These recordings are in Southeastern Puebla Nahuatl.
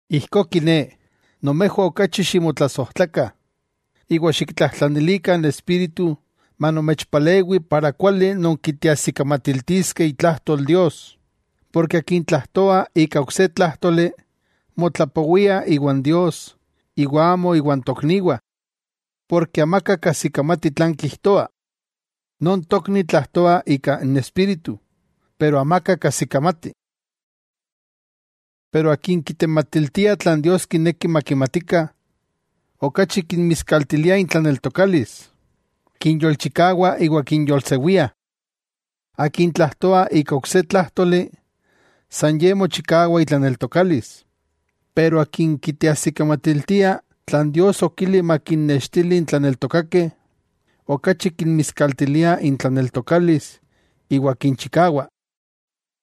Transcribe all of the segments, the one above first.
Ijkó kiné, nomejwah okachi ximotlasojtlakah, iwa xiktlajtlanilikah n Espíritu manomechpalewi para kuali nonkiteajsikamatiltiskeh itlajtol Dios. Porke akin tlajtoa ika ok se tlájtoli, motlapowia iwan Dios iwa amo iwan tokniwah, porke amaka kajsikamati tlan kijtoa. Non tokni tlajtoa ika n Espíritu, pero amaka kajsikamati. Pero akin kitematiltia tlan Dios kineki makimatikah, okachi kinmiskaltilia intlaneltokalis, kinyolchikawa iwa kinyolsewia. Akin tlajtoa ika ok se tlájtoli, san ye mochikawa itlaneltokalis. Pero akin kiteajsikamatiltia tlan Dios okili makinnextili n tlaneltokakeh, okachi kinmiskaltiliah intlaneltokalis iwa kinchikawa.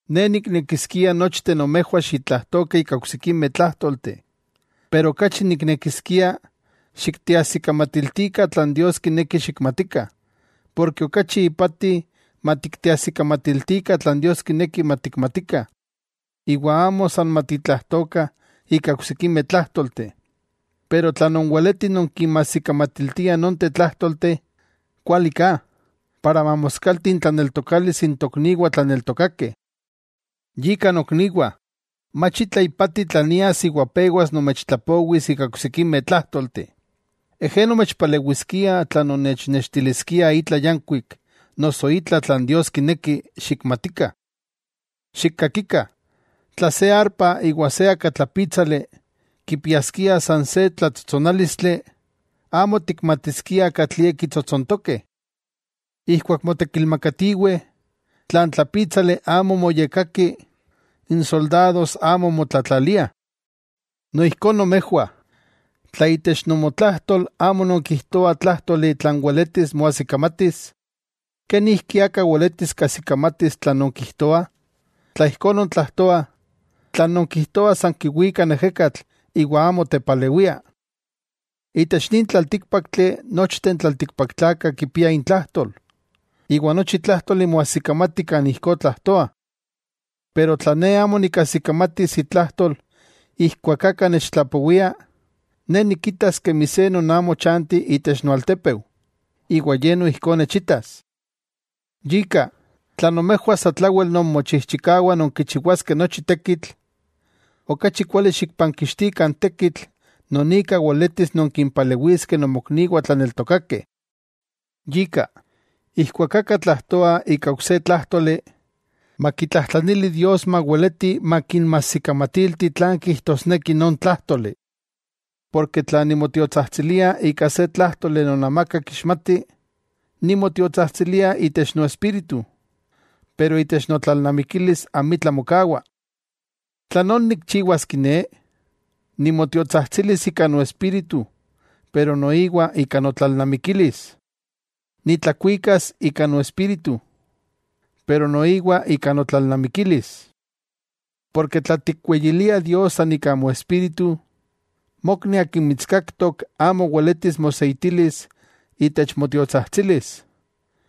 Ne niknekiskia nochteh nomejwah xitlajtokah ika oksikimeh tlájtolteh. Pero okachi niknekiskia xikteajsikamatiltikah tlan Dios kineki xikmatikah. Porke okachi ipati matikteajsikamatiltikah tlan Dios kineki matikmatikah iwa amo san matitlajtokah ika oksikimeh tlájtolteh. Pero tla nonweletih nonkinmajsikamatiltiah nonteh tlájtolteh, kuali ka, para mamoskalti intlaneltokalis n tokniwah tlaneltokakeh. Yika nokniwah, mach itla ipati tla nias iwa pewas nomechtlapowis ika oksikimeh tlájtolteh, ejé nomechpalewiskia tla nomechnextiliskia itla yankuik noso itla tlan Dios kineki xikmatikah. Xikkakikah: tla se arpa iwa se akatlapítsali kipiaskiah san se tlatsotsonálistli, amo tikmatiskiah katlie kitsotsontokeh. Ijkuak motekilmakatiweh, tla n tlapítsali amo moyekkaki, n soldados amo motlatlaliah. Noijkó nomejwah: tla itech nomotlajtol amo nonkijtoah tlájtoli tlan weletis moajsikamatis, ¿kenijki aka weletis kajsikamatis tlan nonkijtoah? Tla ijkó nontlajtoah, tlan nonkijtoah san kiwika n ejekatl iwa amo tepalewia. Itech nin tlaltíkpaktli nochteh n tlaltikpaktlakah kipiah intlajtol, iwa nochi tlájtoli moajsikamatih kan ijkó tlajtoah. Pero tla ne amo nikajsikamatis itlajtol ijkuak aka nechtlapowia, ne nikitas kemi se non amo chanti itech noaltepeu, iwa ye noijkó nechitas. Yika, tla nomejwah satlawel nonmochijchikawah nonkichiwaskeh nochi tekitl, okachi kuali xikpankixtikah n tekitl non ika weletis nonkimpalewiskeh nomokniwah tlaneltokakeh. Yika, ijkuak aka tlajtoa ika ok se tlájtoli, makitlajtlanili Dios maweleti makinmajsikamatilti tlan kijtosneki non tlájtoli. Porke tla nimotiotsajtsilia ika se tlájtoli non amaka kixmati, nimotiotsajtsilia itech noespíritu, pero itech notlalnamikilis amitla mokawa. ¿Tlanón nikchiwas kiné? Nimotiotsajtsilis ika noespíritu pero noiwa ika notlalnamikilis. Nitlakuikas ika noespíritu, pero noiwa ika notlalnamikilis. Porke tla tikweyilia Dios san ika moespíritu, mokni akin mitskaktok amo weletis moseitilis itech motiotsajtsilis,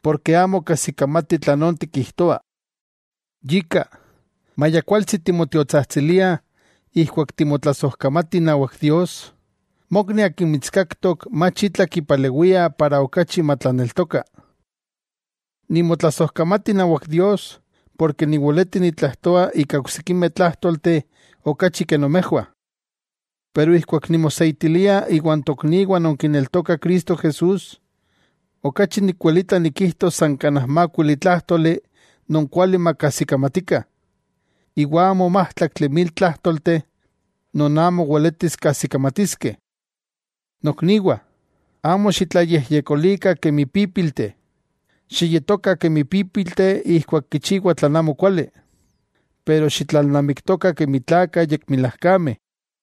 porke amo kajsikamati tlanón tikijtoa. Yika, maya kualtsi timotiotsajtsilia ijkuak timotlasojkamati inawak Dios, mokni akin mitskaktok mach itla kipalewia para okachi matlaneltoka. Nimotlasojkamati inawak Dios porke niweleti nitlajtoa ika oksikimeh tlájtolteh, okachi ke nomejwah. Pero ijkuak nimoseitilia iwa n tokniwah non kineltokah Cristo Jesús, okachi nikwelita nikijtos san kanaj mákuili tlájtoli non kuali makajsikamatikah, iwa amo májtlaktli mil tlájtolteh non amo weletis kajsikamatiskeh. Nokniwah, amo xitlayejyekolikah kemi pípilteh. Xiyetokah kemi pípilteh ijkuak kichiwah tlan amokuali, pero xitlalnamiktokah kemi tlakah yekmilajkameh.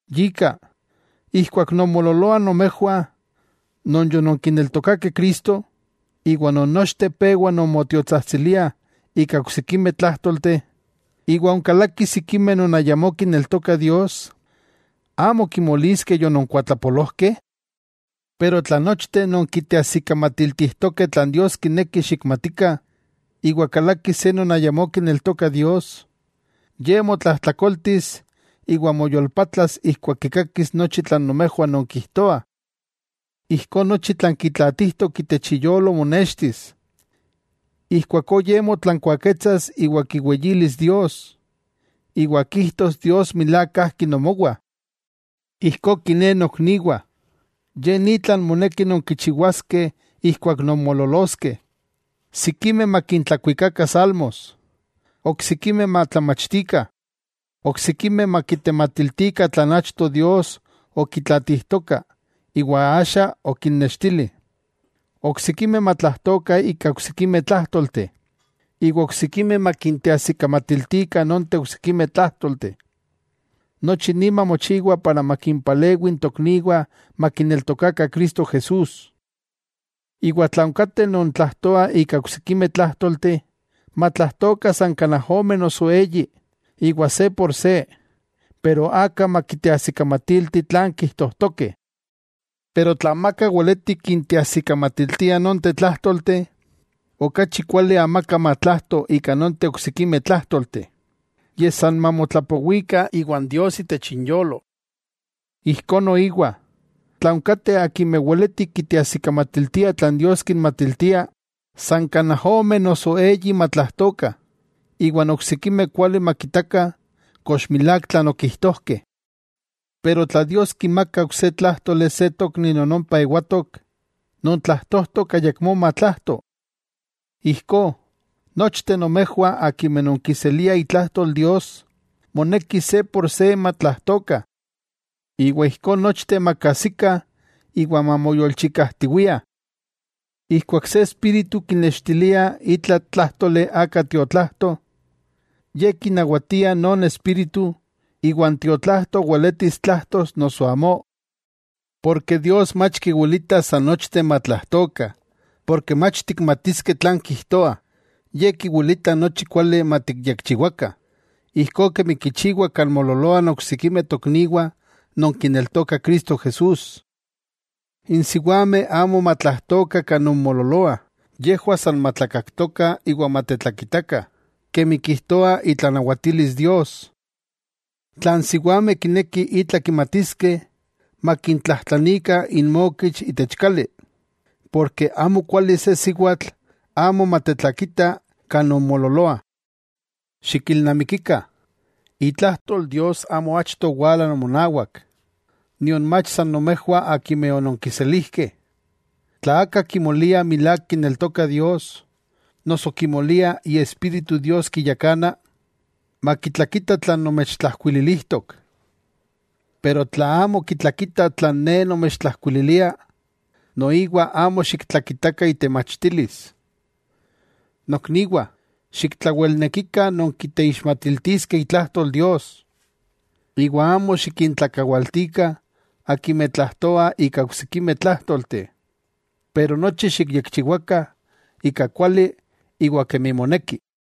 Yika, ijkuak nonmoololoah nomejwah non yononkineltokakeh Cristo iwa non nochteh pewa non motiotsajtsiliah ika oksikimeh tlájtolteh, iwa onkalakih sikimeh non ayamó kineltokah Dios, ¿amo kimoliskeh yononkuatlapolojkeh? Pero tla non nochteh nonkiteajsikamatiltijtokeh tlan Dios kineki xikmatikah, iwa kalaki se non ayamó kineltoka Dios, ye motlajtlakoltis iwa moyolpatlas ijkuak kikakis nochi tlan nomejwah nonkijtoah. Ijkó nochi tlan kitlaatijtok itech iyolo monextis, ijkuakó ye motlankuaketsas iwa kiweyilis Dios, iwa kijtos Dios milák kajki nomowah. Ijkó kiné nokniwah, ye ni tlan moneki nonkichiwaskeh ijkuak nonmoololoskeh: sikimeh makintlakuikakah salmos, oksikimeh matlamachtikah, oksikimeh makitematiltikah tlan achto Dios okitlaatijtoka iwa axa okinnextili, oksikimeh matlajtokah ika oksikimeh tlájtolteh, iwa oksikimeh makinteajsikamatiltikah nonteh oksikimeh tlájtolteh. Nochi ni mamochiwa para makimpalewi n tokniwah makineltokakah Cristo Jesús. Iwa tla onkateh non tlajtoah ika oksikimeh tlájtolteh, matlajtokah san kanaj ome noso eyi, iwa se por se. Pero aka makiteajsikamatilti tlan kijtojtokeh. Pero tla amaka weleti kinteajsikamatiltia nonteh tlájtolteh, okachi kuali amaka matlajto ika nonteh oksikimeh tlájtolteh, yej san mamotlapowikah iwan Dios itech inyolo. Ijkó noiwa, tla onkateh akimeh weletih kiteajsikamatiltiah tlan Dios kinmatiltia, san kanaj ome noso eyi matlajtokah, iwa n oksikimeh kuali makitakah kox milák tlan okijtojkeh. Pero tla Dios kimaka ok se tlájtoli se tokni non ompa ewatok, non tlajtojtok ayakmó matlajto. Ijkó, nochteh nomejwah akimeh nonkiseliah itlajtol Dios, moneki se por se matlajtokah. Iwa ijkó nochteh makajsikah iwa mamoyolchikajtiwiah. Ijkuak se espíritu kinextilia itla tlájtoli aka tiotlajto, ye kinawatia non espíritu iwa n tiotlajto weletis tlajtos noso amó. Porke Dios mach kiwilita san nochteh matlajtokah porke mach tikmatiskeh tlan kijtoah, Ye kiwilita nochi kuali matikyekchiwakah. Ijkó kemi kichiwah kan moololoah n oksikimeh tokniwah non kineltokah Cristo Jesús, n siwameh amo matlajtokah kan nonmoololoah, yejwah san matlakaktokah, iwa matetlakitakah, kemi kijtoa itlanawatilis Dios. Tla n siwameh kinekih itla kimatiskeh, makintlajtlanikah inmokich itech kali, porke amokuali se siwatl amo matetlakita kan nonmoololoah. Xikilnamikikah, itlajtol Dios amo achto owala nomonawak, nion mach san nomejwah akimeh ononkiselijkeh. Tla aka kimolia milák kineltoka Dios, noso kimolia Iespíritu Dios kiyakana, makitlakita tlan nomechtlajkuililijtok. Pero tla amo kitlakita tlan ne nomechtlajkuililia, noiwa amo xiktlakitakah itemachtilis. Nokniwah, xiktlawelnekikah nonkiteixmatiltiskeh itlajtol Dios, iwa amo xikintlakawaltikah akimeh tlajtoah ika oksikimeh tlájtolteh. Pero nochi xikyekchiwakah ika kuali iwa kemi moneki.